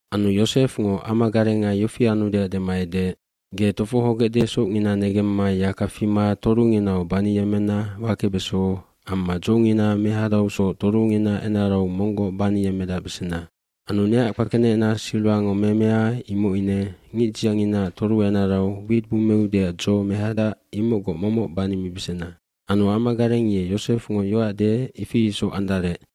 aAnu Yosefngo amagarenga yofi anudeac dema edeec, “Ge tofohogecde socngina negemma yaka fima torunginau baniyemmena wakebeso amma dzongina mehadausoc torungina enarau monggoc baniyemmedacbesena. Anu neac kpakenecna silwango memea imoc ine ngicdzianginaac toru enarau wit bummeudeac dzo mehadac imocgoc momoc banimibesena.” Anu amagareng ye Yosefngo yoac deec ifi isoc andarec.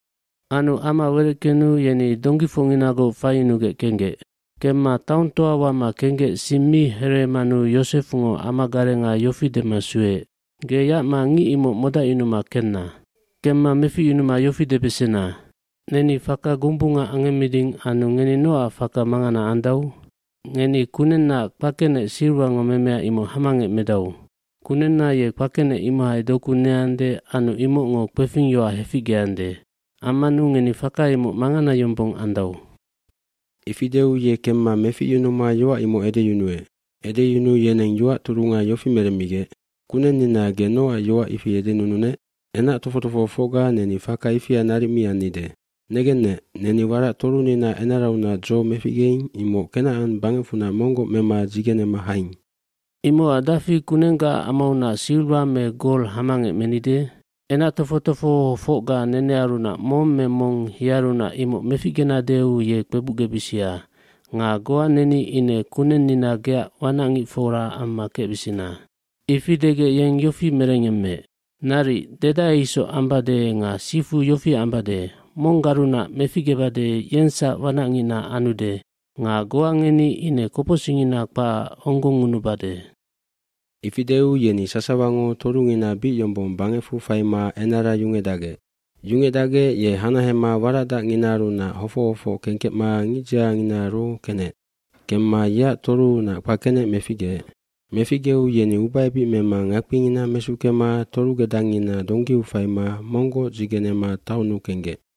Anu ama wereckenu yeni donggifocnginagoc faiyunugec kenggec. Kemma taongtoa wama kenggec sing mi hereemanu Yosefngo amagarenga yofi dema sueec, “Ge yacma ngic imoc modacyunuma kenna. Kemma meficyunuma yofi debesena, ‘Neni faka gombunga angemmeding anu ngeni nocac faka mangana andau? Ngeni kunennaac kpakenec silwango memea imoc hamangec medau. Kunenna ye kpakenec imohai doku neande anu imocngo kpefingyoac heficgeande. Ammanu ngeni faka imoc mangana yombong andau.’” Ifi deu ye kemma meficyunuma yoac imoc edeyunuec. Edeyunuu yeneng yoac turunga yofi meremmigec, “Kunennina, ge nocac yoac ifi edenununec? Enac tofoc tofohofocga neni faka ifia naric mi annide. Negennec, neni warac torunina enaraunac dzo meficgeing imoc Kenacan bangecfunac monggoc mema dzigenema haing. Imocac dafi kunenggaac amaunac silwa me gol hamangec menide? Enac tofoc tofohofocga nenearunac mong me mong yearunac imoc meficgenadeu ye kpebucgebisia nga goa neni ine kunennina, geac wanacngicfora amma kecbisina.” Ifi degec yeng yofi merengyemmeec, “Naric, dedae isoc ambade nga sifu yofi ambade, monggarunac meficgebade yengsac wanacngicna anude nga goa ngeni ine kopocsicngina kpacac onggongngunubade.” Ifi deu yeni sasawango torungina bic yombong bangecfu faima enara yungecdacgec. bYungecdacgec ye hanahema warac dacnginaarunac hofoc hofoc kengkecma ngicdzianginaaru kenec. Kemma yeac toruunac kpakenec meficgeec. Meficgeu yeni ubaebic mema ngakpingina mesuckema torugedangngina donggiu faima monggoc dzigenema taonnu kenggec.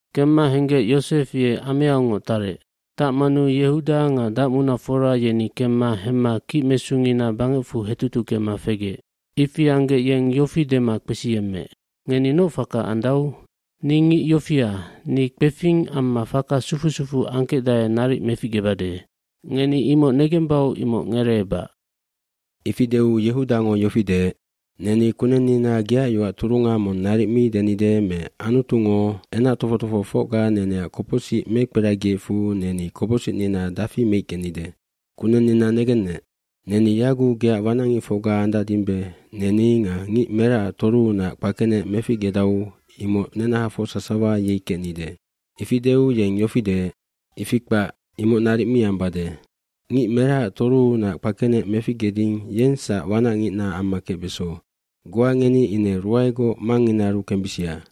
Kemma henggec Yosef ye ameaungoc tarec. Tacmanu Yehuda nga dacmunafora yeni kemma hemma kicmesungina bangecfu hetutuckema fegec. cIfi anggec yeng yofi dema kpesiyemmeec, “Ngeni noc faka andau? Ni ngic yofia, ni kpefing amma faka sufu sufuu angkecdae naric meficgebade. Ngeni imoc negembau imoc ngereebac.” Ifi deu Yehudango yofi deec, “Neni kunennina geac yoac turunga mong naric mi denide me Anutungo enac tofoc tofohofocga neneac kopocsic mekperagiecfu neni kopocsicnina dafi meickenide. Kunennina negennec, neni yaguc geac wanacngicfocga andacdimbe neni nga ngic meracac toruunac kpakenec meficgedau imoc nenahafoc sasawa yei kecnide.” Ifi deu yeng yofi deec, “Ifi kpac, imoc naric mi ambade. Ngic meracac toruunac kpakenec meficgeding yengsac wanacngicna amma kecbeso. Goa ngeni ine ruaegoc mangnginaaru kembisia.”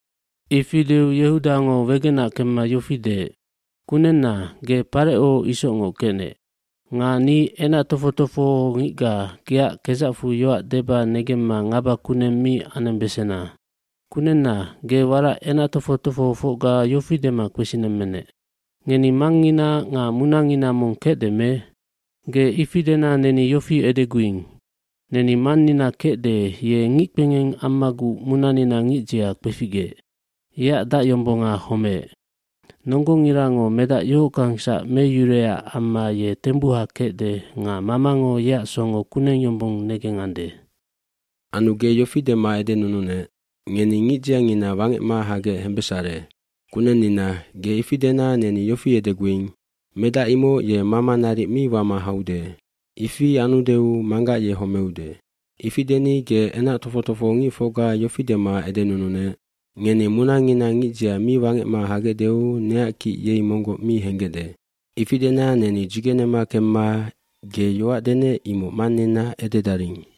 Ifi deu Yehudango wegenac kemma yofi deec, “Kunenna, ge Pareco isocngoc kecnec. Nga ni enac tofoc tofohongicga geac kedzacfu yoac deba negemma ngaba kuneng mi anembesena. dKunenna, ge warac enac tofoc tofohofocga yofi dema kpesinemmenec, ‘Ngeni mangngina nga munangina mong kecde me?’ Ge ifi dena neni yofi edeguing ‘Neni mannina kecde ye ngickpengeng ammaguc munanina ngicdzia kpeficgeec. Yeac dacyombonga homeec. Nonggongirango medac yohockangsac meyuruecac amma ye tembuha kecde nga mamango yeac songo kuneng yombong negengande.’ Anu ge yofi dema edenununec, ‘Ngeni ngicdziangina wangecma hagec hembesare.’ Kunennina, ge ifi dena neni yofi edeguing ‘Medac imoc ye mama naric mi wama haude. Ifi anudeu manggac ye homeude.’ Ifi deni ge enac tofoc tofohongicfocga yofi dema edenununec, ‘Ngeni munangina ngicdzia mi wangecma hagecdeu neac kic yei monggoc mi henggecde.’ Ifi dena neni dzigenema kemma ge yoac denec imoc mannina ededaring.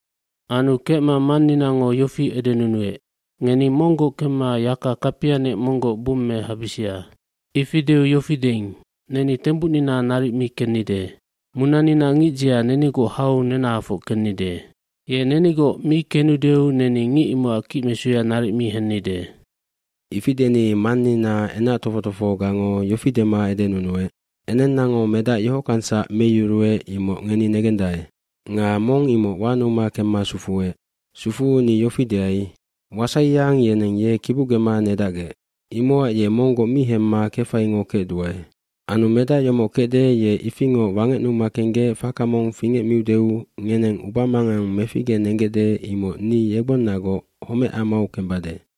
Anu kecma manninango yofi edenunuec, ‘Ngeni monggoc kemma yaka kapianec monggoc bummehabisia.’ Ifi deu yofi deing, ‘Neni tembucnina naric mi kennide. Munanina ngicdzia nenigoc hau nenahafoc kennide. Ye nenigoc mi kenudeu neni ngic imocac kicmesuya naric mi hennide.’” “Ifi deni mannina enac tofoc tofohogango yofi dema edenunuec, ‘Enennango medac yohockangsac meyuruec imoc ngeni negendae. Nga mong imoc wanuma kemma sufuec. Sufuu ni yofi deai, “Wasaiyang yeneng ye kibucgema nedacgec.” Imocac ye monggoc mi hemma kefaingo kecduae. Anu medac yomoc kecde ye ifingoc wangecnuma kenggec faka mong fingecmiudeu ngeneng ubamangang meficgenenggecde imoc ni yegbonnagoc homecamau kembade.’”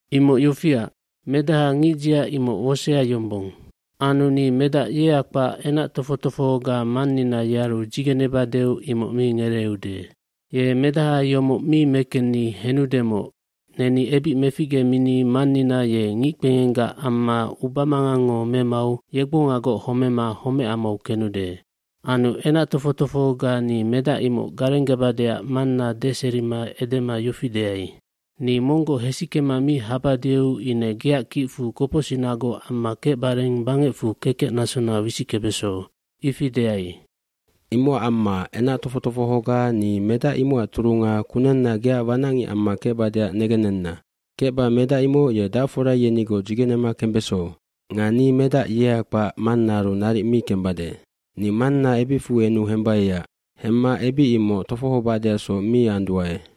“Imoc yofiac, medaha ngicdzia imoc wosea yombong. Anu ni medac yea kpac enac tofoc tofohoga mannina yearu dzigenebadeu imoc mi ngereeude. Ye medaha yomoc mi mekenni henudemoc neni ebic meficgemini mannina ye ngickpengenggac amma ubamangangngo memau yegbongagoc homema homecamau kenude. eAnu enac tofoc tofohoga ni medac imoc garenggebadeac manna deserima edema yofi deai, ‘Ni monggoc hesickema mi habadeu ine geac kicfu kopocsicnagoc amma kecbareng bangecfu kekecnasona wisickebeso.’ Ifi deai. Imocac amma enac tofoc tofohoga ni medac imocac turunga kunenna geac wanacngic amma kecbadeac negennena. Kecba medac imoc ye dacfora yenigoc dzigenema kembeso. Nga ni medac yea kpac mannaaru naric mi kembade. Ni manna ebicfu enu hembaiac. Hemma ebic imoc tofohobadeacsoc mi anduae.”